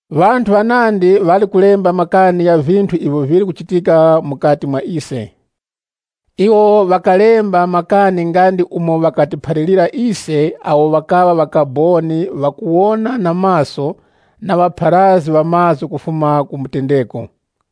Ŵanthu ŵanandi ŵali kulemba makani gha vinthu ivyo vili kuchitika mukati mwa ise. Iwo ŵakalemba makani nga ndi umo ŵakatiphalirira ise awo ŵakaŵa ŵakaboni ŵakuwona na maso na ŵapharazgi ŵa mazgu kufuma ku mutendeko.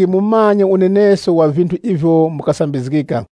Ndachita ntheura mwakuti mumanye unenesko wa vinthu ivyo mukasambizgika.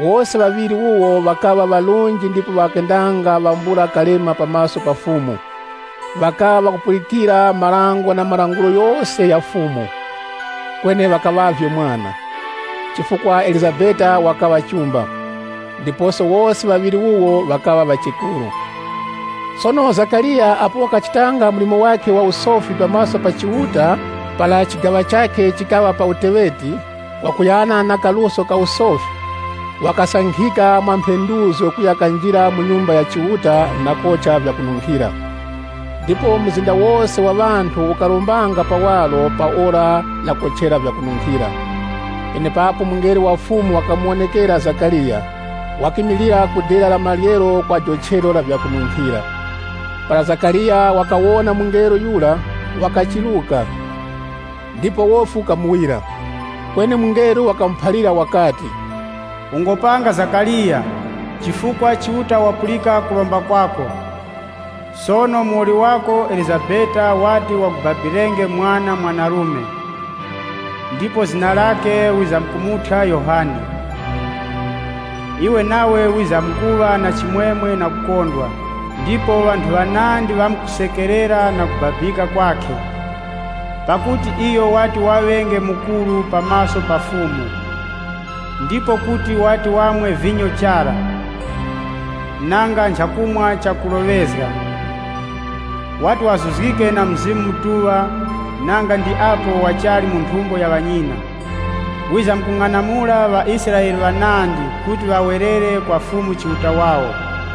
Wose ŵaŵiri wuwo ŵakaŵa ŵarunji ndipo ŵakendanga ŵambula kalema pa maso pa Chiuta. Ŵakaŵa ŵakupulikira marango na malangulo ghose gha Fumu. Kweni ŵakaŵavye mwana, chifukwa Elizabeti wakaŵa chumba. Ndiposo wose ŵaŵiri wuwo wakaŵa ŵachekuru. Sono Zakariya apo wakachitanga mlimo wakhe wa usofi pa maso pa Chiuta para chigaŵa chakhe chikaŵa pa uteŵeti, kwakuyana na kaluso ka usofi, wakasankhika mwa mphenduzgo kuya kanjira mu Nyumba ya Chiuta na kocha vyakununkhira. Ndipo mzinda wose wa ŵanthu ukarombanga pawaro pa ora lakochera vyakununkhira. Penepapo mungelo wa Fumu wakamuwonekera Zakariya wakimilira ku dera la maryero la jochero la vyakununkhira. Para Zakariya wakawona mungelo yura, wakachiruka, ndipo wofi ukamuwira. Kweni mungelo wakamuphalira wakati, “Ungopanga Zakariya, chifukwa Chiuta wapulika kuromba kwako. Sono muwoli wako Elizabeti wati wakubabirenge mwana mwanarume, ndipo zina lakhe wizamkumuthya Yohane. Iwe wizamkuŵa na chimwemwe na kukondwa ndipo ŵanthu ŵanandi ŵamkusekerera pakubabika kwakhe, pakuti iyo wati ŵaŵenge mukuru pa maso pa Fumu. Iyo kuti wati wamwe vinyo chara, nanga ndi moŵa. Wati wazuzgike na Mzimu Mutuŵa, nanga ndi apo wachali mu nthumbo ya ŵanyina. Wizamkung'anamula ŵaIsraele ŵanandi kuti ŵawerere kwa Fumu Chiuta wawo.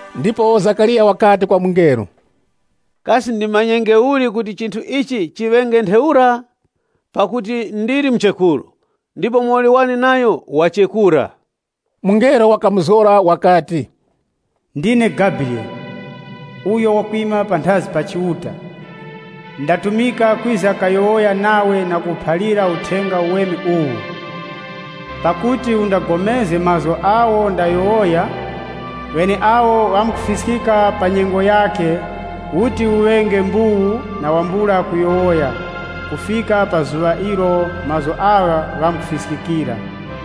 Ndipo Zakariya wakati kwa mungelo, “Kasi ndimanyenge uli kuti chinthu ichi chiŵenge ntheura? Pakuti ndili muchekuru, ndipo muwoli wane nayo wachekura.” Mungelo wakamuzgora wakati, “Ndine Gabriyele uyo wakwima panthazi pa Chiuta. Ndatumika kwiza kayowoya nawe na kukuphalira uthenga uweme uwu. Pakuti undapulikane na mazgu agho ndayowoya, gheneagho ghamkufiskika pa nyengo yakhe, ukharenge chete na wambula kuyowoya kufika pa zuŵa ilo mazgu agha ghamkufiskikira.”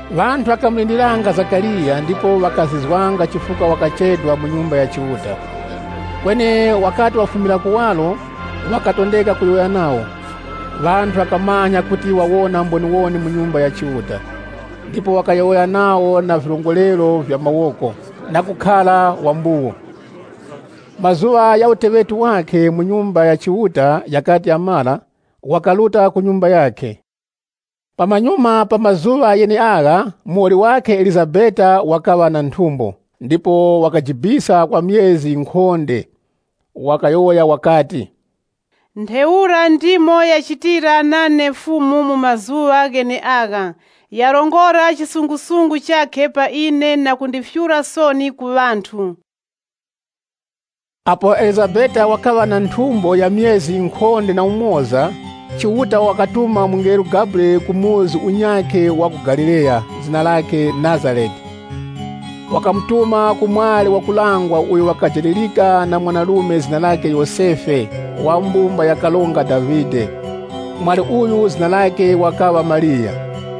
Ŵanthu ŵakamulindiriranga Zakariya, ndipo ŵakazizwanga chifukwa wakachedwa mu Nyumba ya Chiuta. Kweni wakati wafumira kuwaro, wakatondeka kuyowoya nawo. Ŵanthu ŵakamanya kuti wawona mboniwoni mu Nyumba ya Chiuta. Ndipo wakayowoya nawo na virongorero vya mawoko, na kukhara wa mbuwu. Mazuŵa gha uteŵeti wakhe mu Nyumba ya Chiuta ghakati ghamara, wakaruta ku nyumba yakhe. Pamanyuma pa mazuŵa gheneagha, muwoli wakhe Elizabeti wakaŵa na nthumbo, ndipo wakajibisa kwa myezi yinkhonde. Wakayowoya wakati, “Ntheura ndimo yachitira nane Fumu mu mazuŵa gheneagha, yarongora kutemwa kwakhe pa ine na kundifyura soni ku ŵanthu.” Apo Elizabeti wakaŵa na nthumbo ya myezi yinkhonde na umoza, Chiuta wakatuma mungelo Gabriyele ku msumba unyakhe wa ku Galileya, zina lakhe Nazarete. Wakamutuma ku mwali wakulangwa uyo wakajalirika na mwanarume zina lakhe Yosefe, wa mbumba ya Karonga Davide. Mwali uyu zina lakhe wakaŵa Mariya.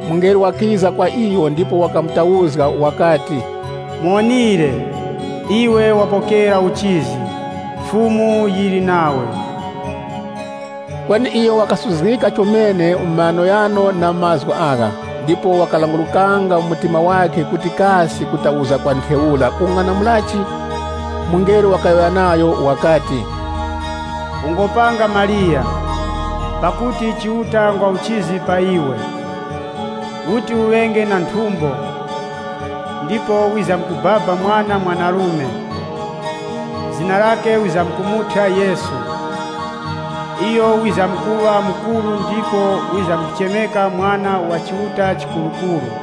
Mungelo wakiza kwa iyo, ndipo wakamutauzga wakati, “Muwonire, imwe mwapokera uchizi, Fumu yili namwe!” Kweni Mariya wakasuzgika chomene mu maghanoghano na mazgu agha, ndipo wakalangurukanga mu mtima wakhe kuti kasi kutauzga kwa ntheura kukung'anamulachi? Mungelo wakayowoya nayo wakati, “Mungopanga, Mariya, pakuti Chiuta ngwa uchizi pa imwe. Muti muŵenge na nthumbo, ndipo muti mubabenge mwana mwanarume. Zina lakhe muti mumuthyenge Yesu. Iyo wizamkuŵa mukuru ndipo wizamkuchemeka Mwana wa Chiuta Chikurukuru.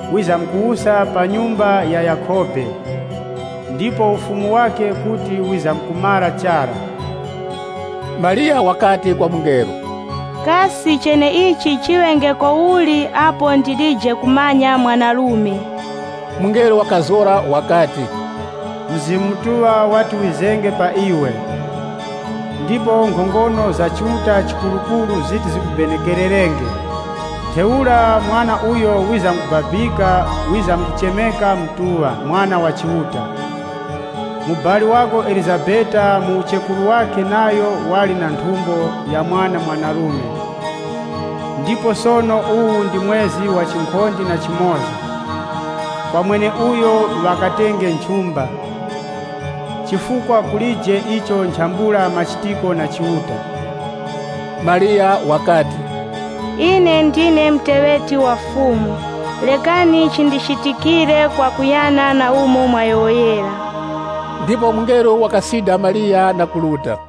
Wizamkuwusa swii pa mbumba ya Yakhobe, ndipo Ufumu wakhe kuti wizamkumara chara.” Mariya wakati kwa mungelo, “Kasi cheneichi chiŵengeko uli apo ndilije kumanya mwanarume?” Mungelo wakazgora wakati, “Mzimu Mutuŵa wati wizenge pa imwe, ndipo nkhongono za Chiuta Chikurukuru ziti zimubenekereraninge. Ntheura Mwana uyo wizamkubabika wizamkuchemeka Mutuŵa, Mwana wa Chiuta.” “Mubali winu Elizabeti mu uchekuru wakhe nayo wali na nthumbo ya mwana mwanarume. Ndipo sono uwu ndi mwezi wa chinkhonde na chimoza, kwa mweneuyo ŵakatenge nchumba. Pakuti kulije icho nchambula machitiko na Chiuta.” Mariya wakati, “Ine ndine muteŵeti wa Fumu, rekani chindichitikire kwakuyana na umo mwayowoyera.” Ndipo mungelo wakamusida Mariya, na kuruta.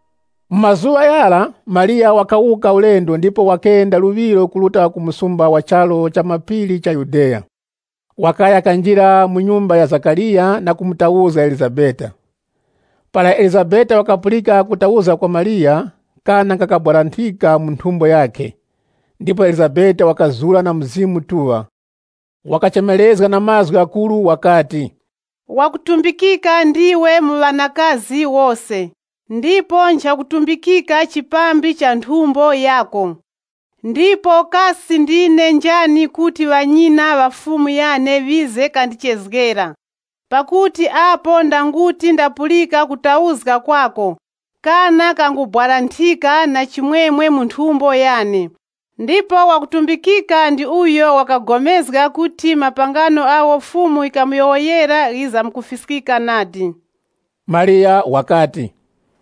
Mu mazuŵa ghara, Mariya wakawuka ulendo ndipo wakenda luŵiro kuruta ku msumba mu charu cha mapiri cha Yudeya. Wakaya kanjira mu mbumba ya Zakariya na kumutauzga Elizabeti. Para Elizabeti wakapulika kutauzga kwa Mariya, kana kakabwaranthika mu nthumbo yakhe. Ndipo Elizabeti wakazura na Mzimu Mutuŵa. Wakachemerezga na mazgu ghakuru wakati, “Ndimwe ŵakutumbikika mu ŵanakazi wose, ndipo nchakutumbikika chipambi cha nthumbo yinu! Ndipo kasi ndine njani kuti ŵanyina ŵa Fumu yane ŵize kandichezgera? Pakuti apo ndanguti ndapulika kutauzga kwinu, kana kangubwaranthika na chimwemwe mu nthumbo yane. Ndipo ngwa kutumbikika ndi mweneuyo wakapulikana kuti mapangano agho Fumu yikamuyowoyera ghizamkufiskika nadi.” Mariya wakati,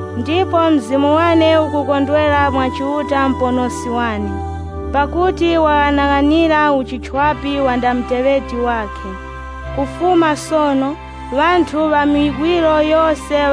ndipo mzimu wane ukukondwera mwa Chiuta Muponoski wane, pakuti waghanaghanira uchichwapi wa nda muteŵeti wakhe. Kufuma sono, ŵanthu ŵa miwiro yose,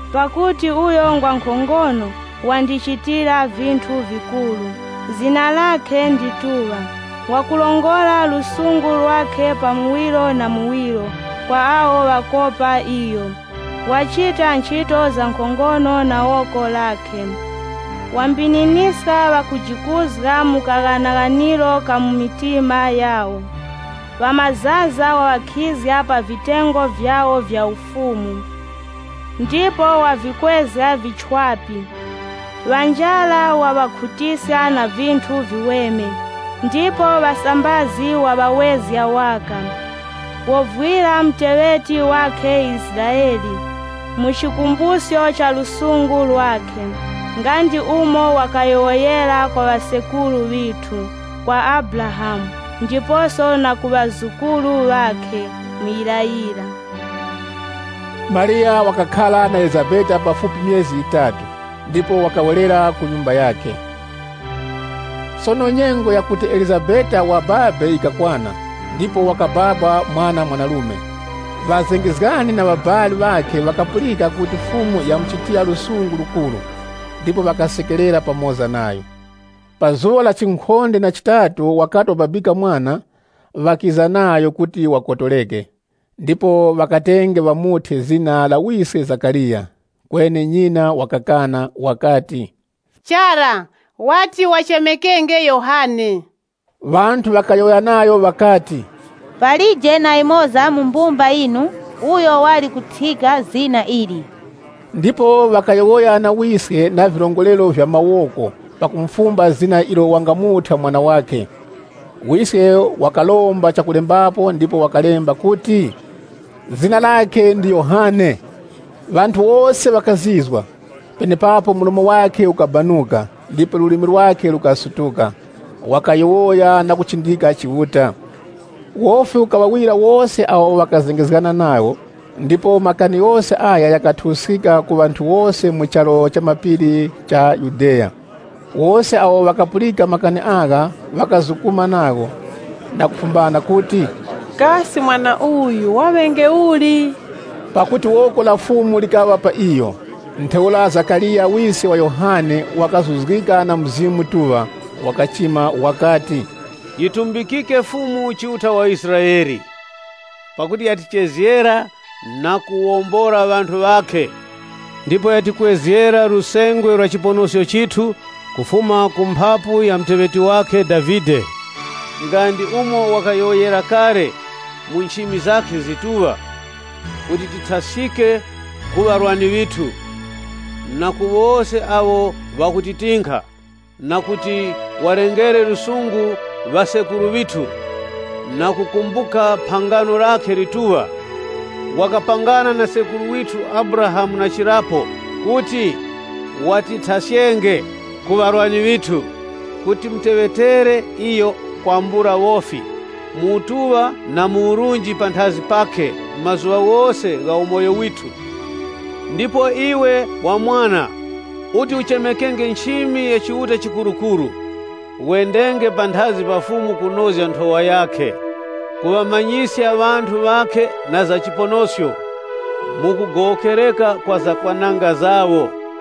pakuti uyo ngwa nkhongono, wandichitira vinthu vikuru. Zina lakhe ndituŵa. Wakurongora lusungu lwakhe pa muwiro na muwiro kwa awo ŵakopa iyo. Wachita nchito za nkhongono na woko lakhe, wambininiska ŵakujikuzga mu kaghanaghaniro ka mu mitima yawo. Ŵamazaza waŵakhizga pa vitengo vyawo vya ufumu, ndipo wavikwezga vichwapi. Ŵa njara waŵakhutiska na vinthu viweme, ndipo ŵasambazi waŵawezga kwambula kanthu. Wovwira muteŵeti wakhe Israele, pakukumbuka lusungu lwakhe, nga ndi umo wakayowoyera kwa ŵasekuru ŵithu, kwa Abrahamu na ku ŵazukuru ŵakhe, muyirayira.” Mariya wakakhara na Elizabeti pafupi myezi yitatu, ndipo wakawerera ku nyumba yakhe. Sono nyengo yakuti Elizabeti wachire yikakwana, ndipo wakababa mwana mwanarume. Ŵazengezgani na ŵabali ŵakhe ŵakapulika kuti Fumu yamuchitira lusungu lukuru, ndipo ŵakasekerera pamoza nayo. Pa zuŵa la chinkhonde na chitatu wakati wababika mwana, ŵakiza nayo kuti wakotoreke. Ndipo ŵakatenge ŵamuthye zina la wiske Zakariya. Kweni nyina wakakana wakati, “Chara nadi. Iyo wati wachemekenge Yohane.” Ŵanthu ŵakayowoya nayo ŵakati, “Palije na yumoza mu mbumba yinu uyo wali kuthyika zina ili.” Ndipo ŵakamufumba wiske na virongorero vya mawoko na zina ilo wangamuthya mwana. Wiske wakaromba chakulembapo ndipo wakalemba kuti, “Zina lakhe ndi Yohane.” Ŵanthu wose ŵakazizwa. Penepapo mlomo wakhe ukabanuka, ndipo lulimi lwakhe lukasutuka, wakayowoya na kuchindika Chiuta. Wofi ukaŵawira wose awo ŵakazengezgana nawo, ndipo makani ghose agha ghakathuwuskika ku ŵanthu wose mu charu cha mapiri cha Yudeya. Wose awo ŵakapulika makani agha, ŵakazukuma nagho, na kufumba kuti, “Kasi mwana uyu waŵenge uli?” Pakuti woko la Fumu likaŵa pa iyo. Ntheura Zakariya wiske wa Yohane, wakazuzgika na Mzimu Mutuŵa, wakachima wakati, “Yitumbikike Fumu, Chiuta wa Israele, pakuti yachezgera ŵanthu ŵakhe na kuŵawombola. Yatikwezgera lusengwe lwa chiponosko, kufuma mu mumba ya muteŵeti wakhe Davide, nga ndi umo yikayowoyera kale, mu nchimi zakhe zakupatulika, kuti tithaskike ku ŵarwani ŵithu, na ku woko la wose awo ŵakutitinkha, na kuti yilengere lusungu ŵasekuru ŵithu, na kukumbuka phangano lakhe lakupatulika. Na chirapo yikapangana na sekuru withu Abrahamu, kuti yitithaskenge ku ŵarwani ŵithu, mwakuti tiyiteŵetere kwambula wofi, mu utuŵa na mu urunji panthazi pakhe, mazuŵa ghose gha umoyo withu. “Ndipo iwe, wa mwana, uti uchemekenge nchimi ya Chiuta Chikurukuru. Wendenge panthazi pa Fumu, kunozga nthowa yakhe. Kuŵamanyiska ŵanthu ŵakhe na za chiponosko, pakugowokereka ku zakwananga zawo.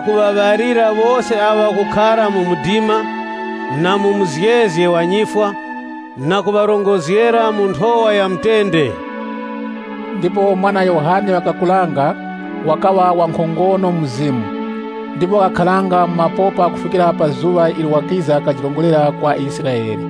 kuŵaŵalira wose awo ŵakukhara mu mdima, na mu muzgezge wa nyifwa, kutirongozgera mu nthowa ya mutende.” Ndipo mwana yura wakakuranga, wakaŵa wankhongono mu mzimu. Ndipo wakakharanga mu mapopa kufikira pa zuŵa ilo wakiza kajirongorera kwa Israele.